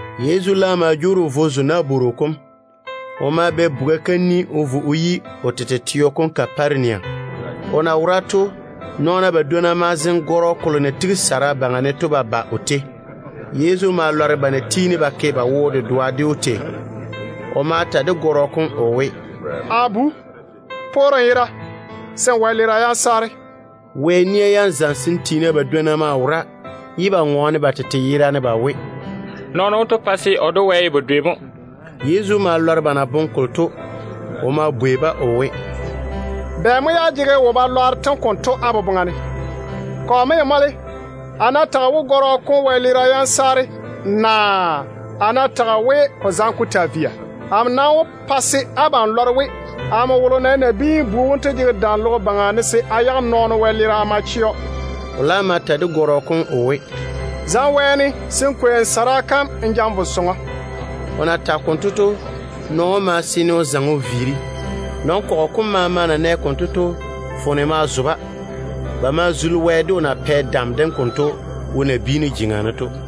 Yezu laam ma jwoori o vo o zo nabworo kom. O ma bɛ buga kam o vo o yi o tete teo Kaparenia. O na wora to, nɔɔna badwonna ma zeŋe gɔrɔ kolo na tigi gungwolo baŋa ne to ba ba o tei. Yezu ma lɔre ba na tiini ba ke ba wo-dedoa ded‑o tei. O ma ta de gɔrɔ kom o we, “A bu, poore n yera, se nmo wɛleera yam saare.” Wɛ nia yam zamesem tiina badwonna maa wora, ye ba ŋɔɔne ba tete yera ne ba we, “Nɔɔno wonto ŋɔɔne o twe Wɛ yere mo.” Yezu ma lɔre ba na boŋe kolo to. O ma bwei-ba o we, “Bɛ mo ye á jege wo-balwaaro tem konto á boboŋa ne? Kɔ mo ye mɔle, a ná tage we gɔrɔ kom wɛleera yam saare, naa a ná tage we o zaŋe o taa via? Amo nam wó pa se abam lɔre we amo wolo na ye Nabiin-bu wom to jege dam logo baŋa ne se a yage nɔɔno wɛleera a ma chɛ‑o.” O laam ma ta de gɔrɔ kom o we, “Zaŋe wɛɛne se n kwei n gungwolo kom n ja n vo sɔŋɔ.” O na tage konto to, nɔɔno wom ma seene o zaŋe o viiri. Nɔn-kɔgɔ kom maama na nɛ konto to, foone ma zo-ba. Ba ma zuli Wɛ de o na pɛ dam dem konto wo nabiinu jeŋa ne to.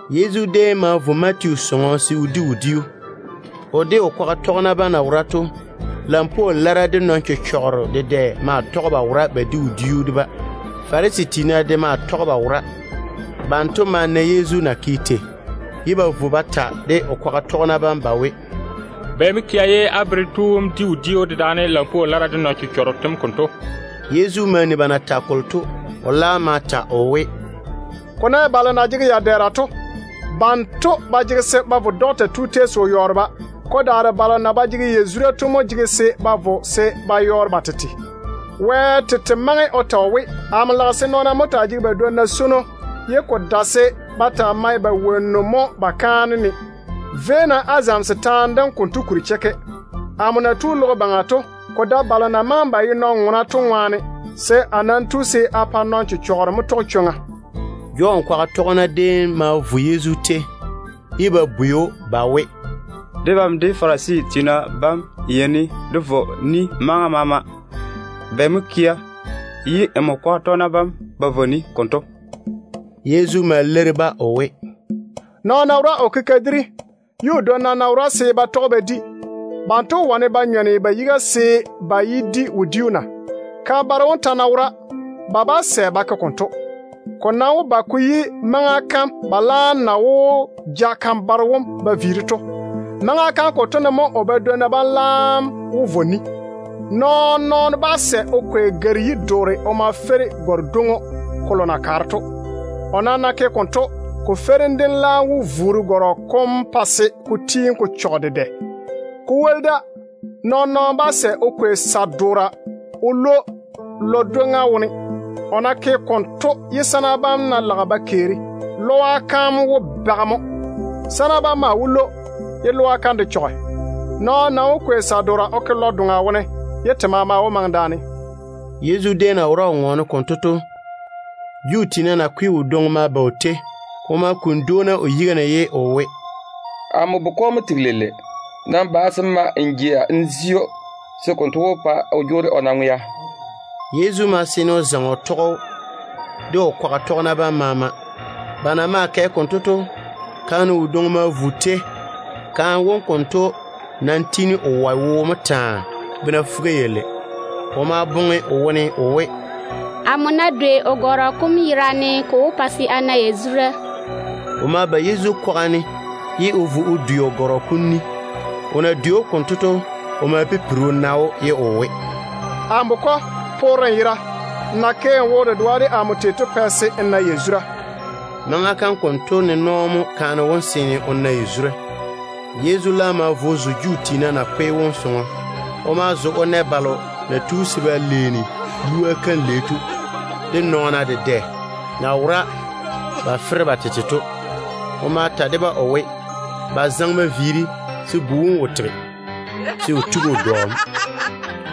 Yezu déem ma vo Matiyu sɔŋɔ se o di wodiu. O de o kwaga tɔgena bam na wora to, lampwoo lara de nɔn-chechɔgero dedɛ maa tɔge ba wora ba di wodiu de-ba. Farisi tiina de maa tɔge ba wora. Banto na nɛ Yezu na ke tei to, ba ma vo ba bwei o kwaga tɔgena bam ba we, “Bɛ mo kea ye á berem tu wom di wodiu dedaane lampwoo lara de nɔn-chechɔgero tem konto?” Yezu ma ni ba na tage kolo to. O laam ma ta o we, “Ko ná ye balo na jege ya-dɛɛra to, banto ba jege se ba vo dɔkta tu tei se o yɔɔre-ba. Ko daare balo na ba jege yazura to mo jege se ba vo se ba yɔɔre ba tete. Wɛ tete maŋe o ta we, ‘Nɔɔna ná jege ba dwonna yibwona, konto pwoli amo wo ko dwoni ba ná ke kaanem ba pa-ne.’ Véi-na á zamese taane dem konto kuri chekke. Amo na tu logo baŋa to, ko dae balo na maŋe ba ye nɔn-ŋona to ŋwaane. A nam tu se a bwoŋi nɔn-chechɔgero mo se ba tɔge chwoŋa.” Jɔn kwaga tɔgena déem ma vo Yezu tei, ye ba bwei‑o ba we, “Debam de Farisi tiina bam yeini dé vɔ ni maŋa maama. Bɛ mo kea ye nmo kwaga tɔgena bam ba vɔ ni konto?” Yezu ma leiri-ba o we, “Nɔɔno ná wora o ke kadiri, ye o dwonna ná wora se ba tɔge ba di, banto wó wane ba nyɔne ba yiga se ba yé di wodiu na? Kan-baro wom ta ná wora, ba bá sɛ ba ke konto. Ko nam wó ba ko yi maŋa kam ba laam na wó ja kan-baro wom ba viiri to. Maŋa kam konto ne mo o badwonna bam laam wó vɔ ni. Nɔɔn-nɔɔno bá sɛ se o kwei gare-yi-doore o ma feiri gare-dwoŋo kolo na kaare to. O ná ke konto, ko feirim dem laam wó vuuri gɔrɔ kom ko pa ko chɔge dedɛ. Ko woli da, nɔɔn-nɔɔno bá sɛ o kwei sa-doora o lwo o ke lɔ-dwoŋa wone. O ná ke konto ye sana bam ná lage ba keeri, lɔa kam wó bage mo. Sana bam maa wó lwo ba yage, ye lɔa kam de chɔge. Nɔɔno nam maŋe se o kwei sa-doora o ke lɔ-doŋa wone, se te maama maŋe daane.” Yezu déem na wora o ŋɔɔne konto to, Juu tiina nakwe wodwoŋi ma ba o tei. O ma kuni dwoona o yiga ne ye o we, “Amo bukɔ mo tega leile. Nam ba se n ma n jea n zi‑o, se konto wó pa o jwoori o na ŋwea.” Yezu ma seene o zaŋe o tɔge‑o, de o kwaga tɔgena bam maama. Ba na maa kɛ konto to, kaane wodwoŋi ma vo o tei. Kaane wom konto nam tiini o wɔe wo mo taa, bena fuga-yalei. O maa boŋe o wone o we, “Amo ná dwei o gɔrɔ kom yerane, ko wó pa se a na yazura.” O ma tɔge Yezu kwaga ne o dwei o gɔrɔ kom ni. O na dwei‑o konto to, Yezu ma pipiri o na‑o ye o we, “Amo bukɔ, poore n yera. Nmo na ke n wo-dedoa de amo to mo pɛ se n na yazura.” Maŋa kam konto ne nɔɔ mo kaane wom seene o na yazura. Yezu laam ma vo o zo Juu tiina nakwe wom sɔŋɔ. O ma zo o na balo na tu se ba leeni lua kam lei to, de nɔɔna dedɛ na wora ba fere ba tete to. O ma ta de-ba o we, ba zaŋe ba viiri, se bu wom wo tege, se o tigi o dɔ mo.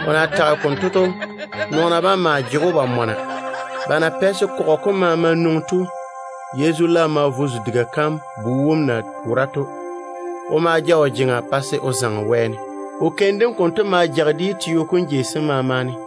O na tage konto to, nɔɔna bam maa jege‑o ba mɔna. Ba na pɛ se kɔgɔ kom maama nwoŋi to, Yezu laam ma vo o zo diga kam bu wom na wora to. O ma ja o jeŋa pa se o zaŋe wɛɛne. O keim dem konto ma jage de yi teo kom jei sem maama ne.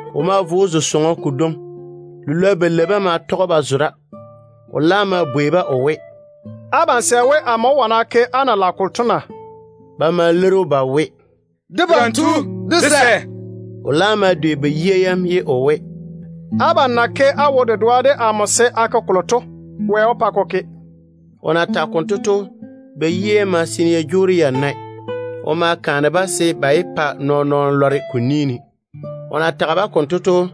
O ma vo o zo sɔŋɔ kodwoŋi. Lilwoa balei bam ma tɔge ba zo da. O laam ma bwei-ba o we, “Abam sɛ we amo wó wane a ke á na lage kolo to na?” Ba ma leiri‑o ba we, “Debam tu, dé sɛ.” O laam ma dwei ba yia yam, ye o we, “Abam na ke á wo-dedoa de amo se a ke kolo to, Wɛ wó pa ko ke.” O na tage konto to, ba yia yam ma seene ya jwoori ya nae. O ma kaane-ba we, ba yé pa nɔɔn-nɔɔno lɔre ko ni ne. O na tage-ba konto to,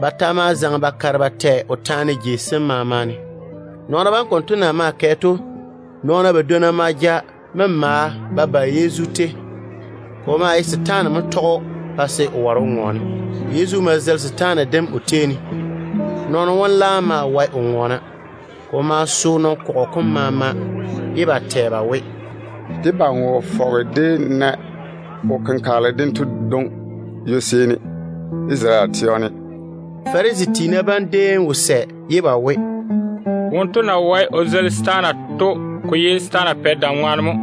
ba ta ma zaŋe ba kare ba tɛ o taane jei sem maama ne. Nɔɔna bam konto na maa kɛ to, nɔɔna badwonna ma ja memaa ba ba Yezu tei. Ko maa ye setaane mo tɔge‑o pa se o ware o ŋɔɔne. Yezu ma zeili setaane dem o tei ne. Nɔɔno wom laam maa wae o ŋɔɔna. Ko ma so nɔn-kɔgɔ kom maama, ye ba tɛ ba we, “Debam wo fɔge dé na wo-kenkagele dento dwoŋi ywo-seeni Isarele teo ne.” Farisi tiina bam déem maa wo sɛ ye ba we, “Wonto na wae o zeili setaana to, ko ye setaana pɛ dam ŋwaane mo.”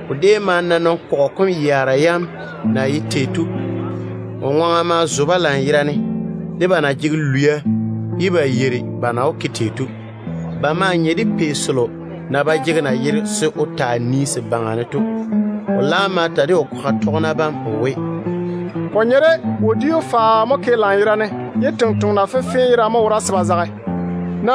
O déem ma na nɔn-kɔgɔ kom yaara yam na ye tei to. Ba ŋwaŋa ma zo‑o lanyerane, de ba na jege lwia ye ba yeiri ba na wó ke tei to. Ba maa nye de pei selo na ba jege nayero se o taa nii se baŋa ne to. O laam ma ta de o kwaga tɔgena bam o we, “Ko nye de wodiu faao na ke lanyerane, ye tontoŋena fenfee yerane wora se ba zage tei to mo.